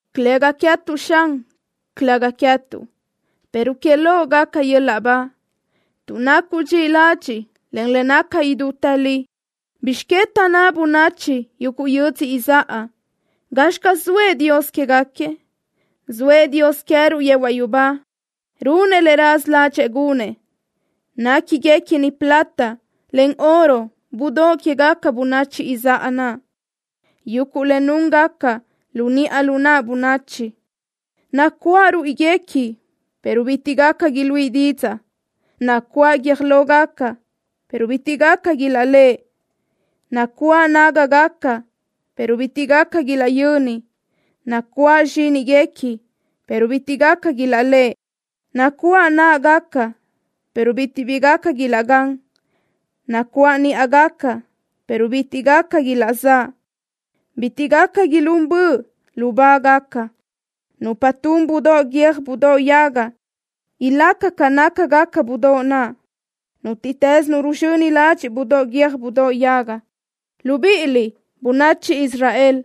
Calëga queë́tuʼ, Xan, calëga queë́tuʼ, pero que loʼ gaca yöl-laʼ ba tuʼ nacuʼ dxiʼi ladxiʼ, en le naca idútë li. ¿Bizx que taʼnná bönachi yuguʼ yödzö izáʼa: “Gazxi caz zoëʼ Dios quégaquiëʼ”? Zoëʼ Dios queë́ruʼ yehuaʼ yubá. Runëʼ le raza ládxëʼë gunëʼ. Néquiguequini plata, en oro budóʼ quégaca bönachi izáʼa naʼ, yuguʼ le núngaca lu niʼa lu naʼ bönachi. Nacuáʼ ruíʼiguequi, pero bitiʼ gaca iluíʼi didzaʼ. Nacuáʼ guiö́j lógaca, pero bitiʼ gaca ilaʼléʼe. Nacuáʼ nágagaca, pero bitiʼ gaca ilaʼyöni. Nacuáʼ zxíniguequi, pero bitiʼ gaca ilaʼlëʼe. Nacuáʼ náʼagaca, pero bitiʼ bi gaca ilaʼgán. Nacuáʼ níʼagaca, pero bitiʼ gaca ilaʼzáʼ. Bitiʼ gaca ilún bö lubáʼagaca. Nupa tun budóʼ guiö́j budóʼ yaga ilaca ca nácagaca budóʼ naʼ, nútiʼtës nu ruzxöni ladxiʼ budóʼ guiö́j budóʼ yaga. Libíʼiliʼ, bönachi Israel,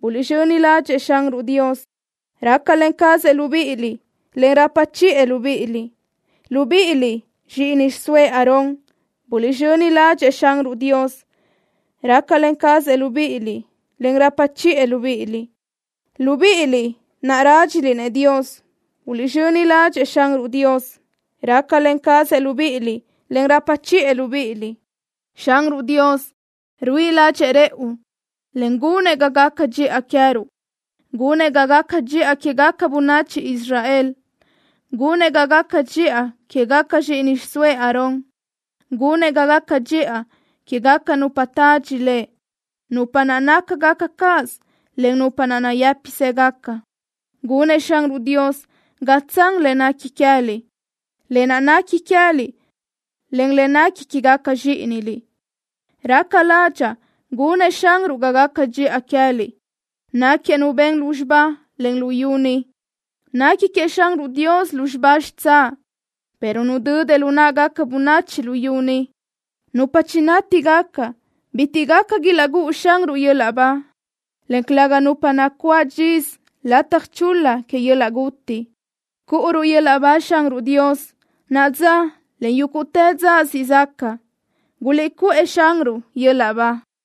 buliʼzxöni ládxëʼë Xanruʼ Dios. Rácalen cazëʼ libíʼiliʼ, en rapa chiʼë libíʼiliʼ. Libíʼiliʼ, zxíʼini xiʼsóëʼ Aarón, buliʼzxöni ládxëʼë Xanruʼ Dios. Rácalen cazëʼ libíʼiliʼ, en rapa chiʼë libíʼiliʼ. Libíʼiliʼ naʼ rádxiliʼ-nëʼ Dios, buliʼzxöni ládxëʼë Xanruʼ Dios. Rácalen cazëʼ libíʼiliʼ, en rapa chiʼë libíʼiliʼ. Xanruʼ Dios ruíʼi ládxëʼë rëʼu, en gunëʼ ga gaca dxiʼa queë́ruʼ. Gunëʼ ga gaca dxiʼa quégaca bönachi Israel. Gunëʼ ga gaca dxiʼa quégaca zxíʼini xiʼsóëʼ Aarón. Gunëʼ ga gaca dxiʼa quégaca nupa tadxi Lëʼ, nupa naʼ nácagaca cáʼasö, en nupa naʼ nayë́pisëgaca. Gunëʼ Xanruʼ Dios ga tsan le nequi queë́liʼ, lë naʼ nequi queë́liʼ, en le nequi quégaca zxíʼiniliʼ. Raca ládxaʼa gunëʼ Xanruʼ ga gaca dxiʼa queë́liʼ. Náquiëʼ Nu ben lúzxiba, en luyú ni. Nequi queëʼ Xanruʼ Dios lúzxiba xitsáʼ, pero nudödëʼ lu náʼagaca bönachi luyú ni. Nupa chinátigaca bitiʼ gaca ilaʼgúʼu Xanruʼ yöl-laʼ ba, en calëga nupa nacuáʼ dxisö lataj chul-la que yöl-laʼ guti. ¡Cúʼuruʼ yöl-laʼ ba Xanruʼ Dios naʼa dza, en yúguʼtë dza siʼ zaca! ¡Guliʼcuʼë Xanruʼ yöl-laʼ ba!